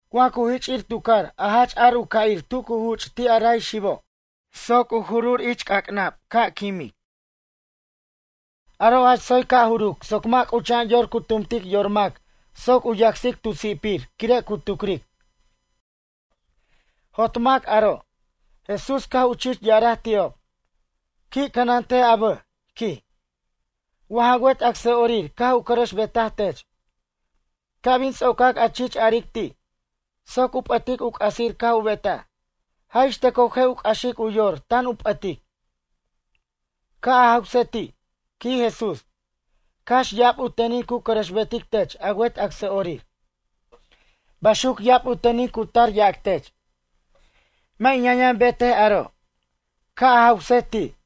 Wa cu jich'ir tu car a jach ar u ca'ir tu cu juch' ti' a ray xibob soc u juruc ich c'ac'nab ca' quimic. Aro' jach tsoy ca' juruc soc mʌ' c'ucha'an yor cu tumtic yor mac soc u yacsic tu si'pir quire' cu tucric: Jot mac aro'. Jesús caj u chich ya'araj ti'ob: ―Qui' cʌnantej a bʌj ―quij―, wa ja wet acsa'orir caj u cʌrʌxbetaj tech. Ca' bin ts'ocac a chich aric ti'. Soc u p'ʌtic u c'asir caj u betaj. Jaj ixtʌcoj je' u c'axic u yor tan u p'ʌtic. Ca' a jawsej ti' ―quij Jesús―. Cax ya'ab u tenin cu cʌrʌxbetic tech a wet acsa'orir. Baxuc ya'ab u tenin cu tar yac tech: “Mʌ' in yʌn yʌn betej aro'.” Ca' a jawsej ti'.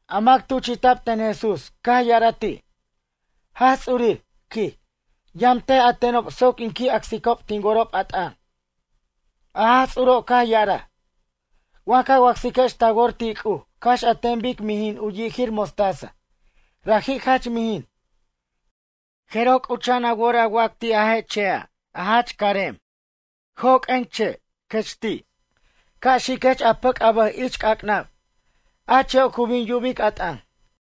A mac tuchi'ta'b ten Jesús caj ya'araj ti': ―Jaj Ts'urir ―quij―, yʌmtej a tenob soc in qui' acsicob tin worob a t'ʌn. A Jaj Ts'uro' caj ya'araj: ―Wa ca wacsiquex ta wor ti' C'uj cax an ten bic mijin u yijir mostaza, raji' jach mijin. Jeroj c'ucha'an a wor a wac ti' a je' che'a' carem: “Joq'uen che' ―quech ti'―. Ca' xiquech a pʌc' a bʌj ich c'ac'nab.” A che'o' cu bin yubic a t'ʌn.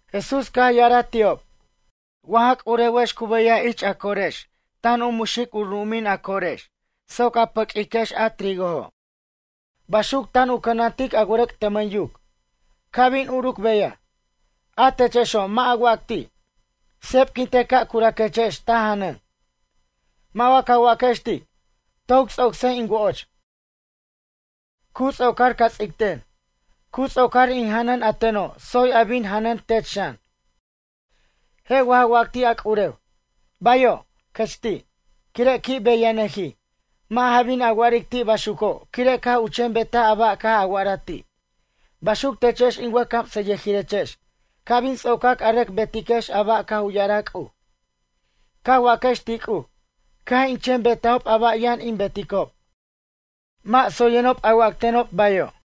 Jesús caj ya'araj ti'ob: ―Wa ja c'urewex cu beyaj ich a corex tan u muxic ru'umin a corex soc a paq'uiquex a trigojo'. Baxuc tan u cʌnantic a wʌrʌc' tʌmʌn yuc, ca' bin uruc beyaj. A techexo' mʌ' a wac ti': “Sepquintej ca' curaquechex ta janʌn.” Mʌ' wa ca waquex ti': “Toc ts'ocsej in wo'och. Cu ts'ocar ca ts'icten. Cu ts'ocar in janʌn a teno' tsoy a bin janen tech xan.” Je' wa ja wac ti' a c'urew: “Bayo'” ―quech ti'―, quire' qui' beyanʌjij? Mʌ' ja bin a wa'aric ti' baxuco' quire' caj u chen betaj a ba' caj a wa'ara ti'. Baxuc techex in wʌjcamsʌyʌjirechex ca' bin ts'ocac a rʌc betiquex a ba' caj u ya'araj C'uj. Ca' a waquex ti' C'uj: “Caj in chen betajob a ba' yʌn in beticob. Mʌ' tsoyenob a wactenob bayo'.”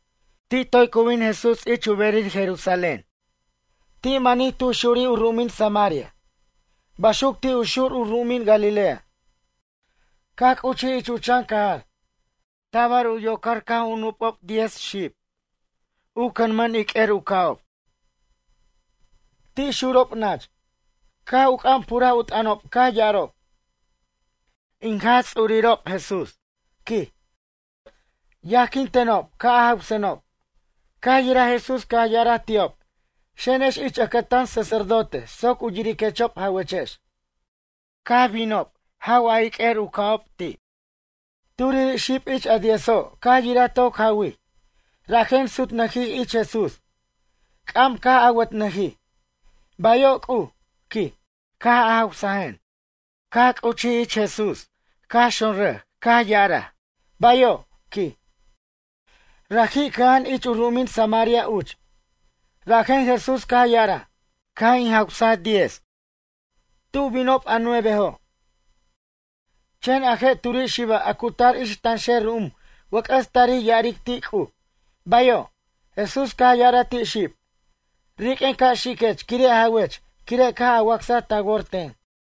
Ti' toy cu bin Jesús ich u berij Jerusalén. Ti' manij tu xurij u ru'umin Samaria. Baxuc ti' u xur u ru'umin Galilea. Caj c'uchij ich u chan cajar. Tabar u yocar caj u nup'ob xib diez, u cʌnmʌn iq'uer u ca'ob. Ti' xurob nach. Caj u c'am puraj u t'ʌnob caj ya'arob: ―In Jaj Ts'urirob Jesús ―quij―, yajquin tenob ca' a jawsenob. Caj yiraj Jesús caj ya'araj ti'ob: ―Xenex ich ʌcʌtan sacerdote soc u yiriquechob jawechex. Caj binob jaw iq'uer u ca'ob ti'. Turiri' xib ich a diezo' caj yiraj toc jawij, rajen sutnʌjij ich Jesús. C'am caj awʌtnʌjij: ―Bayo' C'uj ―quij―, caj a jawsajen. Caj c'uchij ich Jesús caj xonrʌj caj ya'araj: ―Bayo' ―quij. Raji' cʌja'an ich u ru'umin Samaria uch. Rajen Jesús caj ya'araj: ―Caj in jawsaj diez. Tu binob a nuevejo'? Chen a je' turi' xiba' a cu tar ich tanxer ru'um wʌc'ʌs tarij ya'aric ti' C'uj: “Bayo'.” Jesús caj ya'araj ti' xib: ―Riq'uen ca' xiquech quire' jawech quire' caj a wacsaj ta wor ten.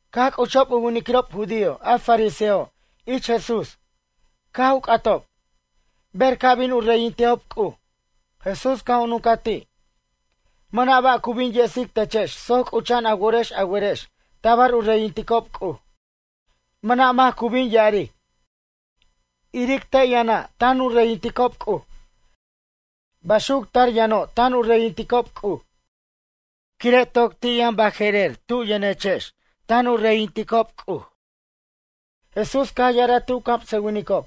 Caj c'uchob u winiquirob judío a fariseojo' ich Jesús. Caj u c'atob: ―Ber ca' bin u reyintejob C'uj? Jesús caj u nuncaj ti': ―Mʌna' ba' cu bin yesic techex soc c'ucha'an a worex a werex tabar u reyinticob C'uj. Mʌna' mac cu bin ya'aric: “Iric te' yʌna' tan reyinticob C'uj. Baxuc tar yʌno' tan u reyinticob C'uj.” Quire' toc ti' yʌn baje'rer tub yʌnechex tan u reyinticob C'uj. Jesús caj ya'araj ti' u camsʌwinicob: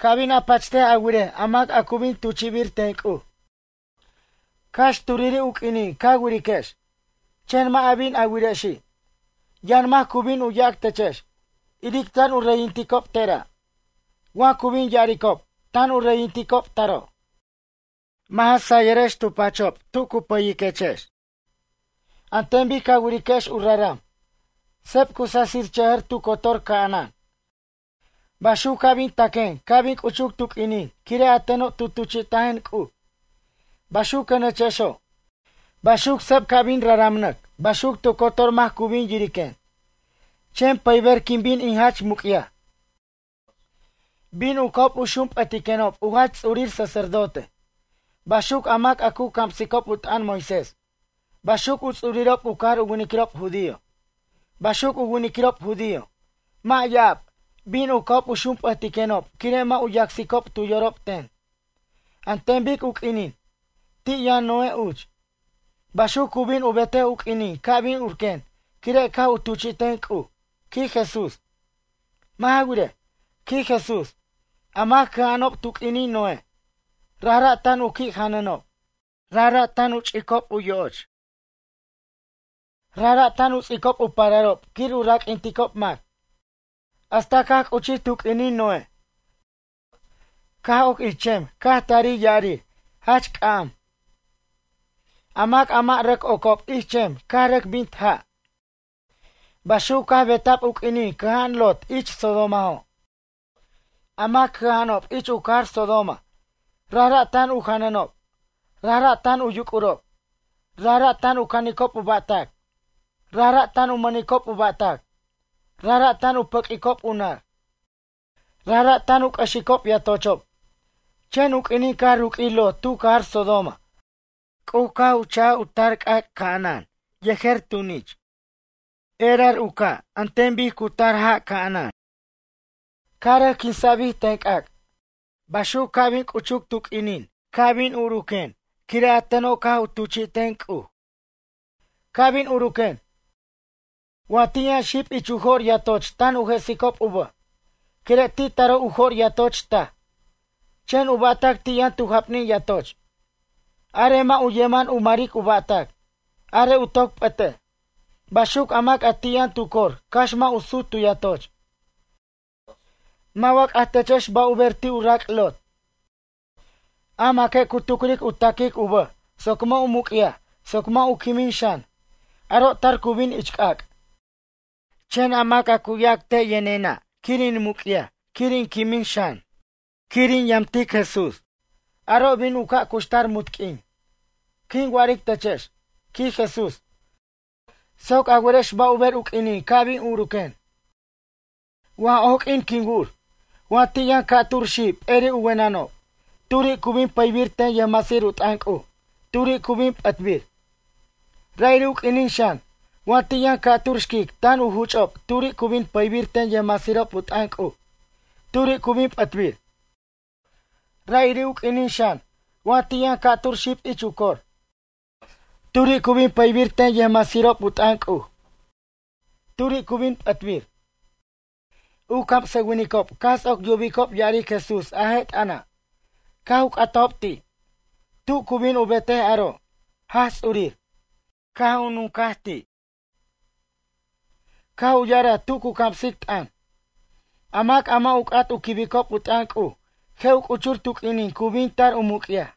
―Ca' bin a pachtej a wirej a mac a cu bin tuchi'bir ten C'uj. Cax turiri' u q'uinin ca wiriquex, chen mʌ' a bin a wirexi'. Yʌn mac cu bin u yac techex: “Iric tan u reyinticob tera'”, wa cu bin ya'aricob: “Tan u reyinticob taro'.” Mʌ' ja sayʌrex tu pachob tu cu payiquechex. An ten bic ca wiriquex u raram. Seb cu sasichʌjʌr tu cotor ca'anan. Baxuc ca' bin taquen ca' bin c'uchuc tu q'uinin quire' a teno' tu tuchi'tajen C'uj, baxuquenechexo'. Baxuc seb ca' bin raramnʌc baxuc tu cotor mac cu bin yiriquen. Chen pʌyber quin bin in jach muc'yaj. Bin u ca'ob u xump'ʌtiquenob u jach ts'urir sacerdote. Baxuc a mac a cu camsicob u t'ʌn Moisés. Baxuc u ts'urirob u cajar u winiquirob judío. Baxuc u winiquirob judío, mʌ' ya'ab. Bin u ca'ob xump'ʌtiquenob quire' mʌ' u yacsicob tu yorob ten. An ten bic u q'uinin, ti' yʌn Noé uch, baxuc cu bin u betej u q'uinin ca' bin urquen quire' caj u tuchi'ten C'uj ―quij Jesús―. Mʌ' ja wirej ―quij Jesús―, a mac cʌja'anob tu q'uinin Noé, rajra' tan u qui' janʌnob. Rajra' tan u ch'icob u yo'och. Rajra' tan u ts'icob u pararob quir u raq'uinticob mac. Hasta caj c'uchij tu q'uinin Noé, caj oc ich chem caj tari ya'arir, jach c'am. A mac mʌ' rʌc ocob ich chem caj rʌc bint ja'. Baxuc caj beta'b u q'uinin cʌja'an Lot ich Sodomajo'. A mac cʌja'anob ich u cajar Sodoma, rajra' tan u janʌnob. Rajra' tan u yuc'urob. Rajra' tan u canicob u ba'tac. Rajra' tan u mʌnicob u ba'tac. Rajra' tan u pʌq'uicob u nar. Rajra' tan u c'ʌxicob yatochob. Chen u q'uinin caj ruq'uij Lot tu cajar Sodoma C'uj caj u chaj u tar c'ac' ca'anan yejer tunich. Erar u ca' an ten bic cu tar ja' ca'anan, caj rʌc quinsa'bij ten c'ac'. Baxuc ca' bin c'uchur tu q'uinin ca' bin urquen quire' a teno' caj u tuchi'ten C'uj. ’Ca' bin uruquen. Wa ti' yʌn xib ich u jo'r yatoch tan u jesicob u bʌjob. Quire' ti' taro' u jo'r yatoch taj, chen u ba'tac ti' yʌn tu japnin yatoch. Arej mʌ' u yeman u maric u ba'tac. Arej u toc p'ʌtej. Baxuc a mac ti' yʌn tu cor cax mʌ' u sut tu yatoch. Mʌ' wa c'ajtechex ba' u ber ti' u rac' Lot? A maque' cu tucric u ta'quic u bʌj soc mʌ' u muc'yaj soc mʌ' u quimin xan, aro' tar cu bin ich c'ac'. Chen a mac a cu yac te' yʌnena' quir in muc'yaj quir in quimin xan, quir in yamtic Jesús. Aro' bin u ca' cuxtar munt q'uin. ’Quin wa'aric techex ―quij Jesús―, soc a werex ba' u ber u q'uinin ca' bin uruquen. Waj oq'uin quin wur. Wa ti' yʌn ca'tur xib p'eri' u wenenob. Turi' cu bin pʌybir ten yʌjmasir u t'ʌn C'uj. Turi' cu bin p'ʌtbir. Ra'iri' u q'uinin xan, wa ti' yʌn ca' tur xquic tan u juch'ob turiri' cu bin pʌybir ten yʌjmasirob u t'ʌn C'uj. Turiri' cu bin p'ʌtbir. Ra'iri' u q'uinin xan, wa ti' yʌn ca'tur xib ich u cor. Turi' cu bin pʌybir ten yʌjmasirob u t'ʌn C'uj. Turi' cu bin p'ʌtbir. U camsʌwinicob caj ts'oc yubicob ya'aric Jesús a je' t'ʌna', caj u c'atajob ti': ―Tu cu bin u betej aro', Jaj Ts'urir? Caj u nunca'b ti', caj u ya'araj tu cu camsic t'ʌn: ―A mac a mʌ' u c'at u quibicob u t'ʌn C'uj je' u c'uchur tu q'uinin cu bin tar u muc'yaj.